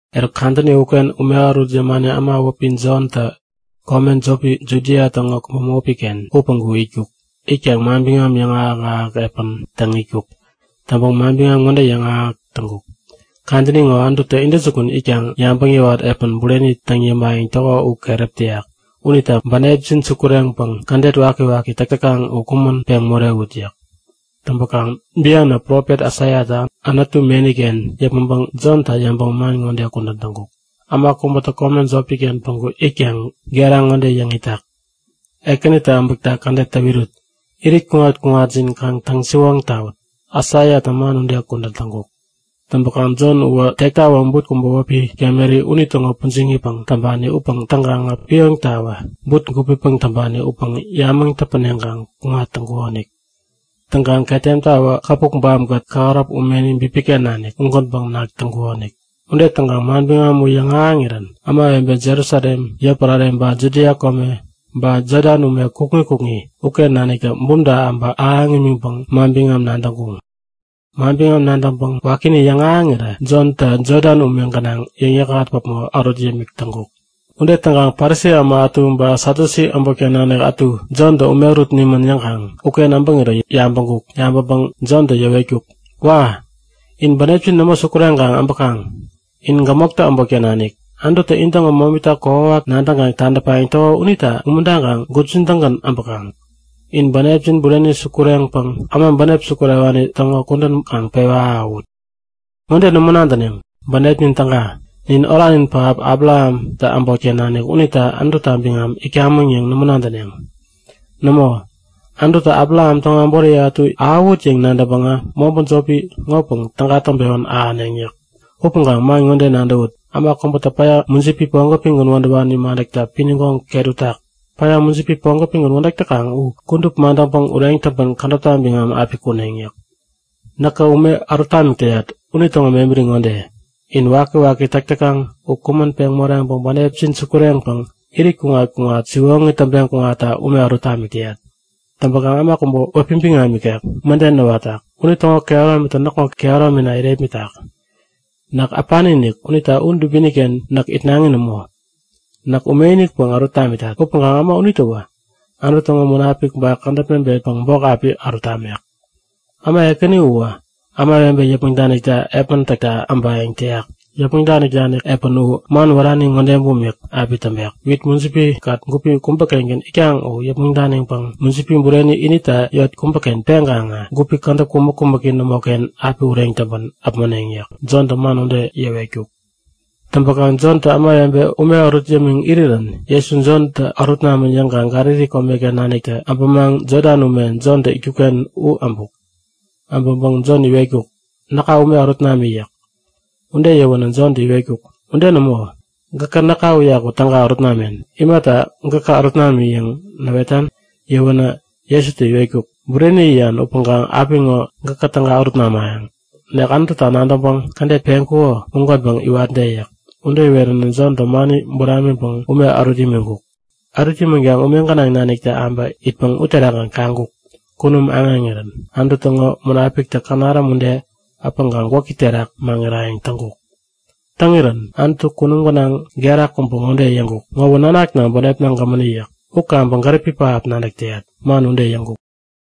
Eruk kadäni uken ume ärut yämani äma wäpi Jontä kome jopi Judia täŋo kome bämopi-ken u päŋku itkuk. Itkaŋ manbiŋam yäŋahäk-ahäk epän täŋ itkuk. Täŋpäŋ manbiŋam ŋode yäŋahäk täŋkuk; Kadäni ŋo Anututä intäjukun itkaŋ yabäŋ yäwat epän bureni täŋ yämayäŋ täko u keräp täyak unita bänepjin sukureŋpäŋ kädet wakiwaki täk täkaŋ u kumän peŋ morewut! yäk. Täŋpäkaŋ bianä profet Aisaiatä Anutu meni-ken yäpmäŋpäŋ Jonta yäŋpäŋ man ŋode kudän täŋkuk; Äma kubätä kome jopi-ken päŋku itkaŋ gera ŋode yäŋ itak; Ekänitä äbäkta kädet täwirut! Irit kuŋat-kuŋatjin kaŋ täŋsiwoŋ tawut! Aisaiatä man ude kudän täŋkuk. Täŋpäkaŋ Jon uwä tektawä but kubä wäpi kameri unitäŋo pujiŋipäŋ täŋpani upäŋ täŋkaŋä pioŋtawä but gupipäŋ täŋpani upäŋ yamäŋ täpäneŋpäŋ kuŋat täŋkukonik. Täŋkaŋ ketemtawä käpukbam-kät kähäräp umeni bipiken nanik ugänpäŋ nak täŋkukonik. Ude täŋkaŋ manbiŋam u yäŋahäŋirän ämawebe Jerusalem yotpärare ba Judia kome ba Jodan ume kukŋi kukŋi uken naniktä bumta äbä ahäŋ imiŋpäŋ manbiŋam nadäŋkuŋ. Manbiŋam nadäŋpäŋ wakini yäŋahäŋirä Jontä Jodan ume gänaŋ yäŋ-yäkŋat päpmo ärut yämik täŋkuk. Ude täŋkaŋ Parisi äma ätu ba Satyusi äbotken nanik ätu Jontä ume ärut nimän yäŋkaŋ uken äbäŋirä yabäŋkuk. Yabäŋpäŋ Jontä yäwetkuk; Wa! In bänepjin nämo sukureŋkaŋ äbäkaŋ. In gämoktä äbotken nanik! Anututä intäŋo momita kokwawak nadäŋkaŋ tadäpayäŋ täko unita umuntaŋkaŋ gupjin-tägän äbäkaŋ? Inä bänepjin bureni-inik sukureŋpäŋ äma bänepi sukurewani täŋo kudän kaŋ pewä ahäwut! Ŋode nämo nadäneŋ; Bänepnin täga. Nin oranin pähap Abrahamtä äbotken nanik unita Anututa biŋam itkamäŋ yäŋ nämo nadäneŋ. Nämo! Anututä Abraham täŋo äboriye ätu ahäwut yäŋ nadäŋpäŋä mobä jopi ŋopäŋ täga täŋpewän ahäneŋ! yäk. Upäŋkaŋ man ŋode nadäwut; Äma kubä päya mujipi pogopigän wädäwani madäkta pinigoŋ ket utak. Päya, mujipi pogopigän wädäk täkaŋ u kudup madäŋpäŋ ureŋ täŋpän kädäpta biŋam api kuneŋ yäk. Näkä ume ärut tamik täyat unitäŋo mebäri ŋode; In wakiwaki täk täkaŋ u kumän peŋ moreŋpäŋ bänepjin sukureŋpäŋ irit kuŋat-kuŋat siwoŋi täŋpeŋ kuŋatta ume ärut tamik täyat. Täŋpäkaŋ äma kubä wäpi biŋam ikek mäden näwatak. Unitäŋo kehärominitä näkŋo kehäromina irepmitak. Näk äpani-inik unita u dubini-ken näk itnaŋi nämo. Näk ume-inikpäŋ ärut tamitat. Upäŋkaŋ äma unitäwä Anutu täŋo Munapik ba kädäp mebetpäŋ bok api ärut tamek yäk. Äma ekäni uwä ämawebe yäpmäŋ danik epän täkta äbayäŋ täyak. Yäpmäŋ danik epän u man wärani ŋode bumik api täŋpek; Wit mujipi-kät gupi kubä-kengän itkaŋ u yäpmäŋ daniŋpäŋ mujipi bureni inita yot kubäken peŋkaŋä gupi kädäp kumäk-kumäki nämoken api ureŋ täŋpän äpmoneŋ yäk. Jontä man ude yäwetkuk. Täŋpäŋ Jontä ämawebe ume ärut yämiŋ irirän Jesu Jontä ärut namän yäŋkaŋ Galili komeken naniktä abämaŋ Jodan ume, Jontä itkuk-ken u äbuk. Äbäŋpäŋ Jon iwetkuk; Näka ume ärut nami yäk. Ude yäwänä Jontä iwetkuk; Ude nämo! Gäkä näka uyaku täga ärut namen. Imata gäkä ärut nami yäŋ näwetan? Yäwänä Jesutä iwetkuk; Bureni yäyan upäŋkaŋ apiŋo gäkä täga ärut namayäŋ. Nek Anututä nadäŋpäŋ kädet peŋkuko ugänpäŋ iwatde yäk. Ude iweränä Jontä mani buramiŋpäŋ ume ärut imiŋkuk. Ärut imänkaŋ ume gänaŋ naniktä abä itpäŋ uterakgän kaŋkuk; Kunum aŋeŋirän Anutu täŋo Munapiktä känaräm ude äpäŋkaŋ gwäki terak maŋirayäŋ täŋkuk. Täŋirän Anutu kunum gänaŋ gera kubä ŋode yäŋkuk; Ŋowä näkŋaken bänepna gämäni yäk. U kaŋpäŋ gäripi pähap nadäk täyat. Man ude yäŋkuk.